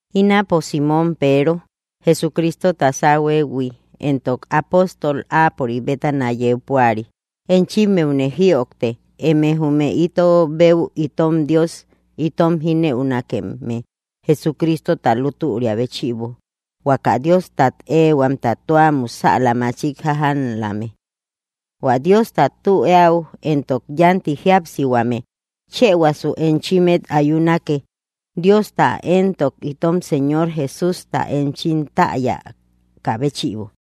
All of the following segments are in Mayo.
Ínapo Simon Peero, Jesucristota sáuhuëhui éntok ápostol áapörik bétana yeu púari, enchimmeune jïojte, eme jume ito beu itom Dios itom jínëukame Jesucristota lútüria béchïbo huaka Diostat ehuamta tua musäla machik jájamlame. Huä Diosta tü eäu éntok yánti jíapsihuame chëhuasu enchimmet ayunake Diosta éntok itom Señor Jesústa enchim täyakä béchïbo.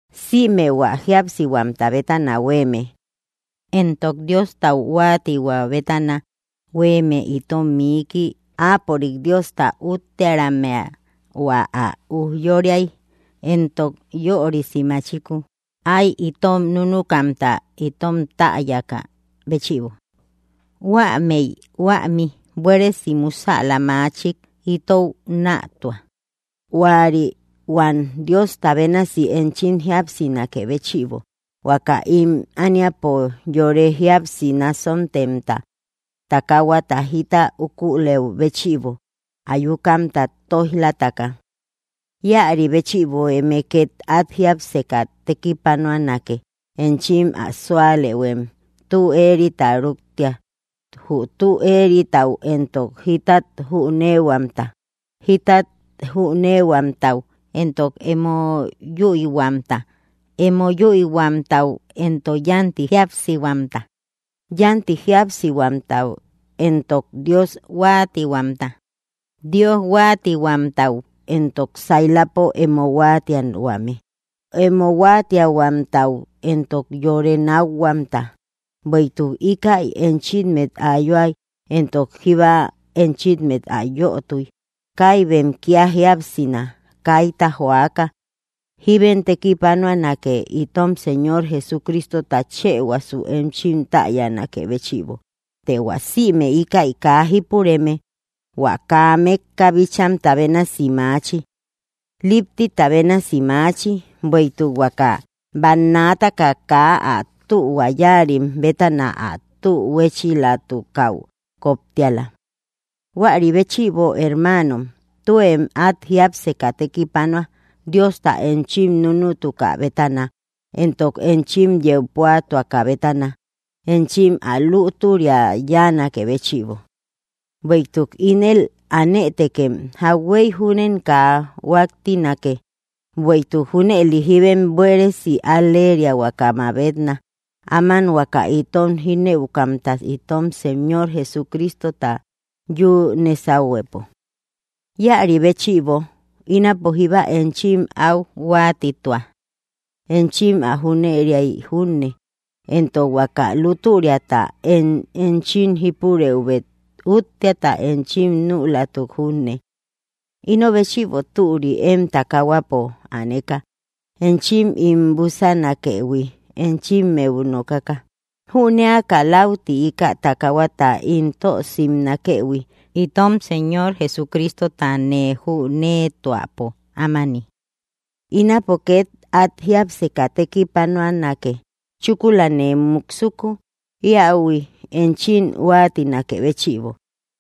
Sïme hua jíapsihuamta bétana huéeme, éntok Diostau huáatihuä bétana huéeme itom miiki áapörik Diosta úttearammea hua ä ujyóriay éntok yörisi machiku ay itom núnukamta itom täyakä béchïbo, huámëi huämi buéresi musäla machik itou nätua, huäri huam Diosta bénasi enchim jíapsinakë béchïbo, huaka ím ániapo yore jíapsi nasontemta takahuata jita ukulëu béchïbo ayukamta tóij‑lataka. Íäri béchïbo eme két át jiápseka tekipanuanake, enchim ä súalëhuem tü éerita rúktia, jü tü éeritau éntok jítat jüneehuamta, jítat jüneehuamtau éntok emo yüihuamta, emo yüihuamtau éntok yánti jíapsihuamta, yánti jíapsihuamtau éntok Dios huáatihuamta, Dios huáatihuamtau éntok sailapo emo huatiahuame, emo huáatiahuamtau entok yore nákhuamta. Bueïtuk íkäi enchimmet ayuak éntok jíba enchimmet ä yötui, kaibem kía jíapsina, kaita joaka, jíbem tekipanuanake itom Señor Jesucristota chëhuasu enchim täyanakë béchïbo. Të hua sïme íkäi kaa jípureme hua kaa mékka bíchamta bénasi maachi; líptita bénasi maachi, bueïtuk huaka bannaataka kaa ä tühua yáarim bétana ä tü huéchilatukäu kóptiala. Huäri béchïbo, hermanom, tuem át jiápseka tekipanua Diosta enchim núnutukä bétana éntok enchim yeu púatuakä bétana enchim ä lútüria yáanakë béchïbo; bueïtuk ínel anëtekem jauhuey júnem kaa huáttinake. Bueïtuk junëli jíbem buéresi al‑leriahuaka mabetna, áman huaka itom jínëukamta itom Señor Jesucristota yü nésahuepo. Íäri béchïbo, ínapo jíba enchim áu huáatitua, enchim ä jüneriay junne, éntok huaka lútüriata én enchim jípurëubet útteata enchim nülatuk junne. Ino béchïbo türi, én takahuapo aneka enchim ín búsanakëhui enchimmeu nokaka; jünéaka lauti íkä takahuata ín tö simnakëhui, itom Señor Jesucristota nee jüneetuäpo ámani. Ínapo két át jiápseka tekipanuanake, chúkula nee muksuko íahuï enchim huáatinakë béchïbo.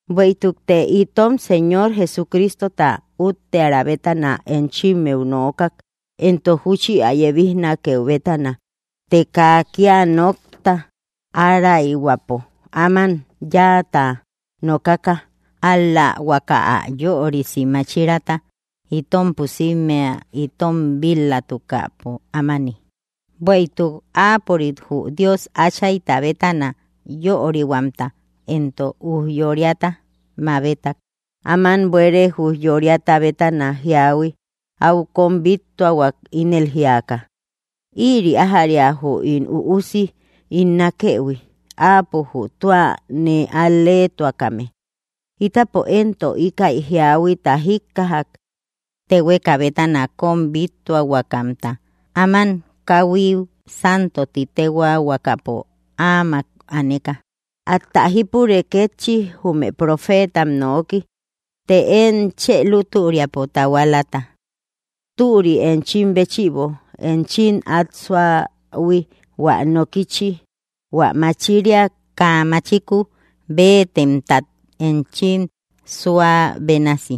Bueïtukte itom Señor Jesucristota útteara bétana enchimmeu nookak éntok júchi ä yebijnakeu bétana, të kaa kía nokta áraihuäpo áman yáata nokaka, ál‑la huaka ä yörisi máchiraata itom pusímmea itom bíl‑latukäpo ámani. Bueïtuk áapörik jü Dios Áchayta bétana yörihuamta éntok ujyóriata mabetak áman buere ujyóriata bétana jíahui áu kóm bíttuahuak ínel jíaka: “Ïri ájäria jü ín Üusi ín nákëhui; áapo jü tua nee al‑leetuakame.” Itapo éntok íkäi jíahuita jíkkajak téhueka bétana kóm bíttuahuakamta, áman káuhui santo ti téhuaahuakapo áamak aneka. Atä jípure kétchi jume profeetam nooki, të én chë lútüriapo tahualata. Türi enchim béchïbo enchim át suähui hua nokichi hua machiria kaa machiku béetemtat enchim suä bénasi,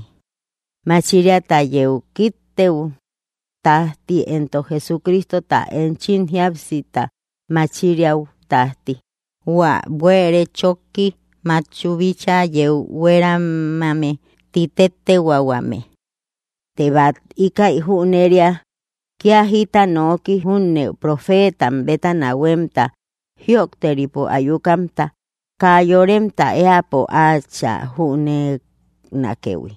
machiriata yeu kíktëu tájti éntok Jesucristota enchim jíapsita machiriäu tájti, hua buere chóki matchuu bíchaa yeu hueramame ti téttehuaahuame. Tem bát íkäi jüneria, kía jita noki júne profetam bétana huémta jïojteripo ayukamta kaa yoremta éäpo áachä jüneenakëhui,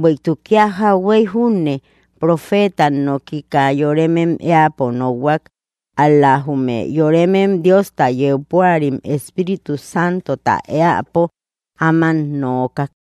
bueïtuk kía jauhuey júne profetam noki kaa yoremem éäpo nokhuak, ál‑la jume yoremem Diosta yeu púarim Espíritu Santota éäpo áman nookak.